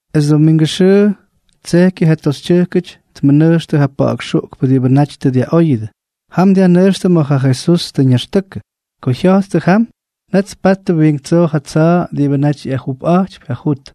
Es domingʉ xʉʉ tsejkyʉ ja toxytyʉjkʉty tmʉnʉjxtʉ ja pa̱ꞌa̱k xuꞌkpʉ diꞌibʉ naty tʉ dyaꞌóyʉdʉ. Jam dyajnʉjxtʉ ma̱ ja Jesús tʉ ñaxtʉkʉ. Ko jya̱jttʉ jam, net tpattʉ wiink tsoo ja tsa̱a̱ diꞌibʉ naty ꞌyagʉꞌʉyꞌajtypy ja jut.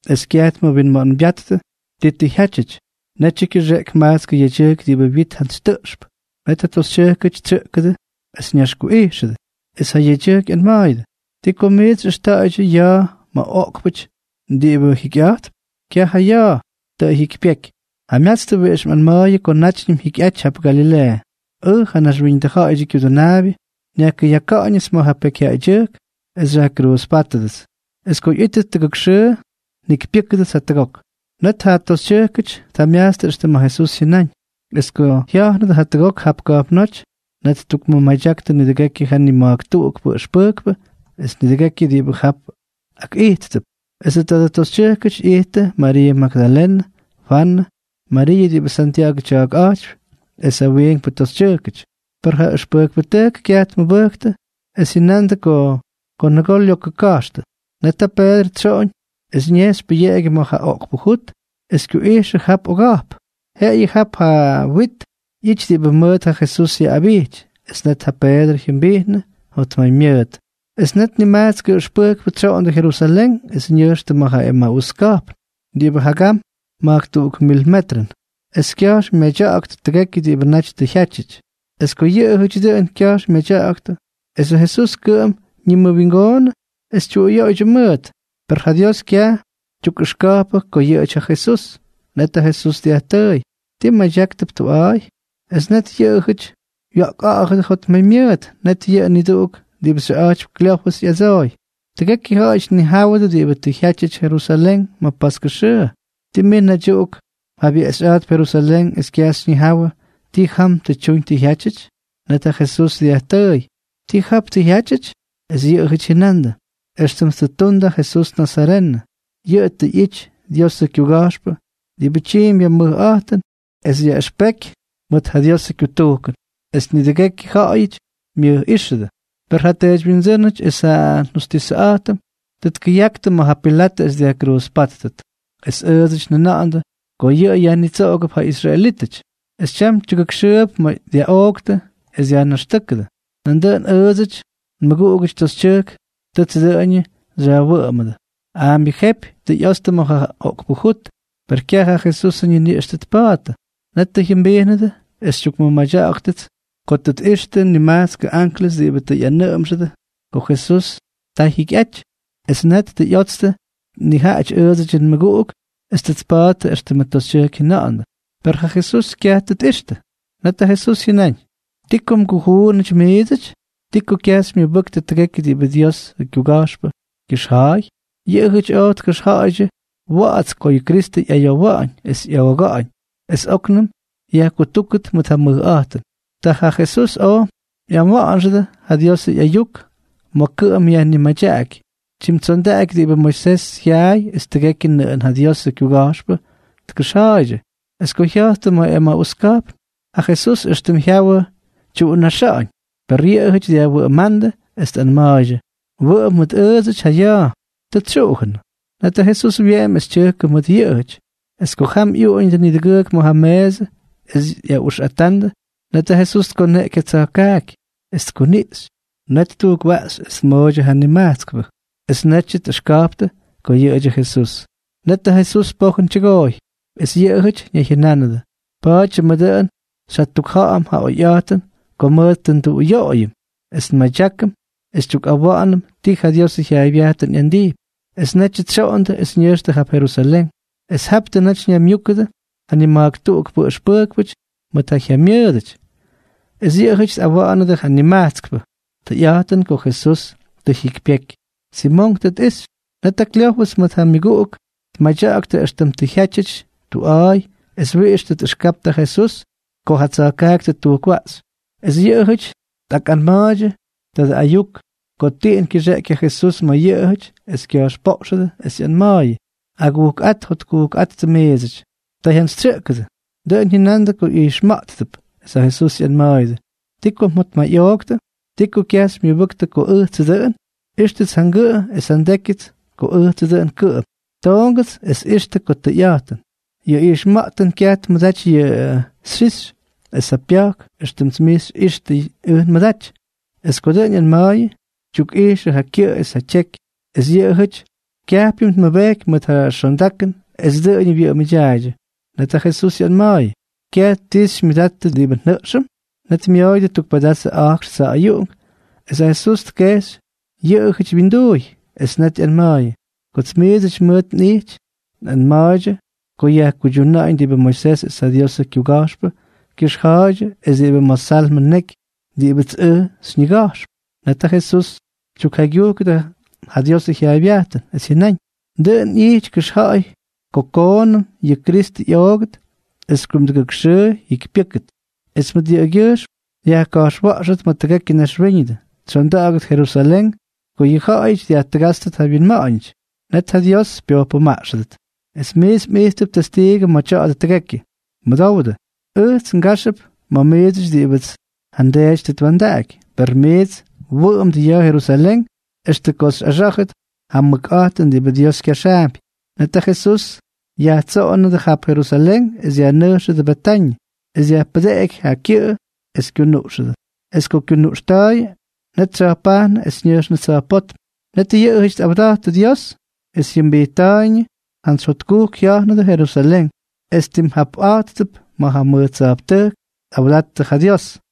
Es kyaj tmʉwinma̱ꞌa̱ñbyáttʉ ti tʉ jyátyʉty. Netyʉ kyʉxeꞌky majtskʉ yedyʉjk diꞌibʉ wyit jantsy tʉꞌxp. Net ja toxytyʉjkʉty tsyʉꞌkʉdʉ es ñaxkuꞌijxʉdʉ, es ja yedyʉjk ꞌyanma̱a̱yʉdʉ: —¿Ti ko miits xyꞌʉxta̱ꞌa̱ydyʉ ya̱a̱ ma̱ oꞌkpʉty diꞌibʉ jikyꞌa̱jtp? Kyaj ja ya̱a̱. Tʉ jyikypyeky. Jamyatstʉ wiꞌix mꞌanma̱a̱yʉ ko nátyñʉm ꞌyity jap Galileeʉ: “Ʉj, ja Naxwíñʉdʉ Ja̱ꞌa̱yʉdyʉ Kyudʉnaabyʉ, nyajkʉyaka̱ꞌa̱ñʉts ma̱ ja pekyjyaꞌaydyʉjk es xyajkruuzpátʉdʉts. Es ko ꞌyítʉt tʉgʉk xʉʉ, njikypyʉ́kʉdʉts jatʉgok.” Net ja toxytyʉjkʉty tjamyajtstʉ éxtʉm ja Jesús jyʉnáñ. Es ko jya̱jnʉdʉ jatʉgok jap ka̱jpnóty, net ttukmʉmadyaktʉ nidʉgekyʉ ja nima̱jk tuꞌukpʉ ʉxpʉjkpʉ es nidʉgekyʉ diꞌibʉ jap akꞌijttʉp. Esʉ tadʉ toxytyʉjkʉty ꞌyijttʉ Mariiʉ Magdalenʉ, Fwanʉ, Mariiʉ diꞌibʉ Santya̱ꞌa̱gʉ tya̱a̱kꞌa̱jtypy, es ja wiinkpʉ toxytyʉjkʉty. Per ja ʉxpʉjkpʉtʉjk kyaj tmʉbʉjktʉ, es jyʉnandʉ ko lokʉ diꞌibʉ kya̱jxtʉp. Net ja Peedrʉ tsyoꞌoñ es ñejxy pʉyeꞌegyʉ ma̱ ja oꞌkpʉ jut es kyuꞌijxʉ jap oga̱jp. Jeꞌeyʉ jap ja wit ꞌyity diꞌibʉ mʉʉt ja Jesús yaꞌꞌabijty. Es net ja Peedrʉ jyʉmbijnʉ jotmaymyʉʉt. Es net nimajtskʉ ʉxpʉjkpʉ tsyoondʉ Jerusalén es ñʉjxtʉ ma̱ ja Emaús ka̱jpn, diꞌibʉ jagam ma̱jk tuk mil metrʉn, es kya̱jx myadya̱ꞌa̱ktʉ tʉgekyʉ diꞌibʉ naty tʉ jyátyʉty. Es ko yʉꞌʉjʉty dʉꞌʉn kya̱jx myadya̱ꞌa̱ktʉ esʉ Jesús kʉꞌʉm ñiwingoonʉ es tyuꞌuyoꞌoydyʉ mʉʉt. Per ja Dios kyaj tyukꞌʉxka̱jpʉ ko yʉꞌʉjʉty ja Jesús. Net ja Jesús dyajtʉʉy: —¿Ti mmadyáktʉp tuꞌa̱a̱y? Es net yʉꞌʉjʉty wya̱ꞌkꞌa̱ꞌa̱dʉ jotmaymyʉʉt. Net yʉꞌʉ niduꞌuk diꞌibʉ xyʉꞌa̱jtypy Kleofʉs ꞌyadsooy: —Tʉgekyʉ ja̱ꞌa̱yʉty tnijáwʉdʉ diꞌibʉ tʉ jyátyʉty Jerusalén ma̱ paskʉ xʉʉ. ¿Tii mij naydyuꞌuk mjabyeꞌxyꞌa̱jtp Jerusalén es kyaj xyñijawʉ ti jam tʉ tyuñ tʉ jyátyʉty? Net ja Jesús dyajtʉʉy: —¿Ti jap tʉ jyátyʉty? Es yʉꞌʉjʉty jyʉnandʉ: —Extʉm tʉ ttundʉ ja Jesús nazarenʉ. Yʉꞌʉ tʉ ꞌyity Diosʉ kyuga̱jxpʉ diꞌibʉ tyiimpy ja mʉjꞌa̱jtʉn es yaꞌʉxpeky mʉt ja Diosʉ kyutujkʉn, es nidʉgekyʉ ja̱ꞌa̱yʉty myʉjꞌíxʉdʉ. Per ja teedywyindsʉ́nʉty es ja njustisʉꞌa̱jtʉm tʉ tkʉyaktʉ ma̱ ja Pilatʉ es dyajkruuzpátʉt. Es ʉʉdsʉty njʉna̱ꞌa̱ndʉ ko yʉꞌʉ yajnitsoꞌogʉp ja israelítʉty. Es tyam tyʉgʉkxʉʉp ma̱ dyaꞌooktʉ es dyajnaxtʉ́kʉdʉ. Nandʉꞌʉn ʉʉdsʉdyʉ nmʉguꞌugʉty toxytyʉjk tʉts dʉꞌʉñʉ xyajwʉꞌʉmʉdʉ. Aambyʉ jepy tʉ ꞌyotstʉ ma̱ ja oꞌkpʉ jut, per kyaj ja Jesusʉ ñiniꞌx tʉ tpa̱a̱ttʉ. Net tʉ jyʉmbijnʉdʉ es xytyukmʉmadya̱ꞌa̱ktʉts ko tʉ tꞌixtʉ nimajtskʉ anklʉs diꞌibʉ tʉ ꞌyanʉʉmʉdʉ ko Jesús taa jyikyꞌaty. Es net tʉ ꞌyotstʉ nijaꞌajʉty ʉʉdsʉdyʉ nmʉguꞌuk es tʉ tpa̱a̱ttʉ éxtʉmʉ toxytyʉjk jyʉna̱ꞌa̱ndʉ, per ja Jesús kyaj tʉ tꞌixtʉ. Net ja Jesús jyʉnáñ: —¿Ti ko mgujuunʉty miidsʉty? ¿Ti ko kyaj xymyʉbʉktʉ tʉgekyʉ diꞌibʉ Diosʉ kyuga̱jxpʉ kyʉxja̱a̱y? Yʉꞌʉjʉty oj tkʉxja̱ꞌa̱ydyʉ wa̱ꞌa̱ts ko yʉ Kristʉ ꞌyayowa̱ꞌa̱ñ es ꞌyooga̱ꞌa̱ñ es óknʉm yajkutúkʉt mʉt ja mʉjꞌa̱jtʉn. Ta ja Jesús oj ꞌyawa̱ꞌa̱nxʉdʉ ja Diosʉ ꞌyayuk ma̱ kʉꞌʉm yajnimadyaꞌaky, tyimtsondaꞌaky diꞌibʉ Moisés jyaay es tʉgekyʉ nʉꞌʉn ja Diosʉ kyuga̱jxpʉ tkʉxja̱a̱ydyʉ. Es ko jya̱jttʉ ma̱ Emaús ka̱jpn, ja Jesús éxtʉm jyawʉ tyuꞌunaxáñ. Per yʉꞌʉjʉty dyajwʉꞌʉmándʉ es tꞌanma̱a̱ydyʉ: —Wʉꞌʉm mʉt ʉʉdsʉty ja ya̱a̱. Tʉ tsyuꞌujʉnʉ. Net ja Jesús wyeꞌemy es tyʉjkʉ mʉt yʉꞌʉjʉty. Es ko jam ꞌyuꞌuñʉ nidʉgʉʉk ma̱ ja meesʉ es ꞌyaꞌuxꞌata̱ꞌa̱ndʉ, net ja Jesús tkoneꞌky ja tsa̱jkaaky, es tkuniꞌxy. Net ttujkwaꞌxy es tmooydyʉ ja nimajtskpʉ. Es netyʉ tꞌʉxka̱jptʉ ko yʉꞌʉdyʉ Jesús. Netʉ Jesús pojʉn tyʉgooy. Es yʉꞌʉjʉty ñayjyʉnánʉdʉ: —Pa̱a̱dyʉmʉ dʉꞌʉn xyjatukja̱ꞌa̱m ja oyꞌa̱jtʉn ko mʉt tʉ nduꞌuyoꞌoyʉm es nmadyákʉm es xytyukꞌawa̱ꞌa̱nʉm ti ja Diosʉ jyaaybyajtʉn ꞌyandijpy. Es netyʉ tsyoꞌondʉ es ñʉjxtʉ jap Jerusalén. Es jap tʉ naty ñaymyúkʉdʉ ja nima̱jk tuꞌukpʉ ʉxpʉjkpʉty mʉt ja jyamyʉʉdʉty. Es yʉꞌʉjʉty tꞌawa̱ꞌa̱nʉdʉ ja nimajtskpʉ: —Tʉyꞌa̱jtʉn ko ja Jesús tʉ jyikypyeky. Simonk tʉ tꞌixy. Net ja Kleofʉs mʉt ja myʉguꞌuk tmadyaktʉ éxtʉm tʉ jyátyʉty tuꞌa̱a̱y es wiꞌix tʉ tꞌʉxkaptʉ ja Jesús ko ja tsa̱jkaaky tʉ ttujkwaꞌxy. Es yʉꞌʉjʉty tꞌakmadya̱ꞌa̱ktʉ tadʉ ayuk ko tiꞌin kyʉxeꞌky ja Jesús ma̱ yʉꞌʉjʉty es kya̱jxpoꞌxʉdʉ, ꞌyanma̱a̱yʉ: —Agujkꞌát jotkujkꞌáttʉ miidsʉty. Ta jyantsytsyʉꞌkʉdʉ. Dʉꞌʉn jyʉnandʉ ko ijxma̱ꞌttʉp. Es ja Jesús ꞌyanma̱a̱yʉdʉ: —¿Ti ko mjotmayꞌooktʉ? ¿Ti ko kyaj xymyʉbʉktʉ ko ʉjtsʉ dʉꞌʉn? Ixtʉts ja ngʉꞌʉ es ja ndékyʉts ko ʉjtsʉ dʉꞌʉn kʉꞌʉm. Toongʉts es ixtʉ ko tʉyꞌa̱jtʉn. Yʉ ijxma̱ꞌtʉn kyaj tmʉdaty yʉ xyixy es ja pya̱jk éxtʉm miits xyꞌíxtʉts ʉj nmʉdaty. Es ko dʉꞌʉn ꞌyanma̱a̱yʉ, tyukꞌijxʉ ja kyʉꞌʉ es ja tyeky. Es yʉꞌʉjʉty kyajpyʉm tmʉbeky mʉt ja xondakʉn es dʉꞌʉñʉ wyʉꞌʉmʉdyaaydyʉ. Net ja Jesús ꞌyanma̱a̱yʉ: —¿Kyaj ti xymyʉdattʉ diꞌibʉ njʉꞌxʉm? Net myooyʉdʉ tuk pedazʉ a̱jkx tsa̱ꞌa̱yuꞌunk. Es ja Jesús tjeꞌxy yʉꞌʉjʉty wyinduuy. Es net ꞌyanma̱a̱yʉ: —Kots miidsʉty mʉʉt nꞌijty, nꞌanma̱a̱ydyʉ ko yajkuydyuna̱ꞌa̱ñ diꞌibʉ Moisés es ja Diosʉ kyuga̱jxpʉ kyʉxja̱a̱ydyʉ es diꞌibʉ ma̱ Salmʉ neky diꞌibʉts ʉj xyñiga̱jxp. Net ja Jesús tyukjaygyujkʉdʉ ja Diosʉ jyaaybyajtʉn, es jyʉnáñ: —Dʉꞌʉn ꞌyity kʉxja̱ꞌa̱y ko koonʉm yʉ Kristʉ ꞌyoogʉt, es kumdʉgʉk xʉʉ jyikypyʉ́kʉt. Es mʉt yʉꞌʉgyʉjxm yajka̱jxwa̱ꞌxʉt ma̱ tʉgekyʉ naxwíñʉdʉ, tsyonda̱ꞌa̱gʉt Jerusalén, ko yʉ ja̱ꞌa̱yʉty dyajtʉgátstʉt yʉ wyinma̱ꞌa̱ñʉty, net ja Dios pyojpʉmaꞌxʉdʉt. Es miits mꞌijttʉp testiigʉ ma̱ tya̱a̱dʉ tʉgekyʉ. Mʉdowdʉ. Ʉjts ngáxʉp ma̱ miidsʉty diꞌibʉts ja nDeety tʉ twa̱ndaꞌaky. Per miits wʉꞌʉmdʉ ya̱a̱ Jerusalén extʉ ko xyꞌaxá̱jʉt ja mʉkꞌa̱jtʉn diꞌibʉ Dios kyaxaampy. Net ja Jesús yajtsoꞌonʉdʉ jap Jerusalén es yajnʉjxʉdʉ Betañʉ, es dyajpʉdeꞌky ja kyʉꞌʉ es kyunuꞌxʉdʉ. Es ko kyunuꞌxta̱a̱yʉ, net tsya̱jpajnʉ es ñʉjxnʉ tsa̱jpótm. Net yʉꞌʉjʉty tꞌawda̱ttʉ Dios es jyʉmbijtta̱a̱yñʉ, jantsy jotkujk jya̱jnʉdʉ Jerusalén. Es tim japꞌa̱jttʉp ma̱ ja mʉj tsa̱jptʉjk es tꞌawdattʉ ja Dios.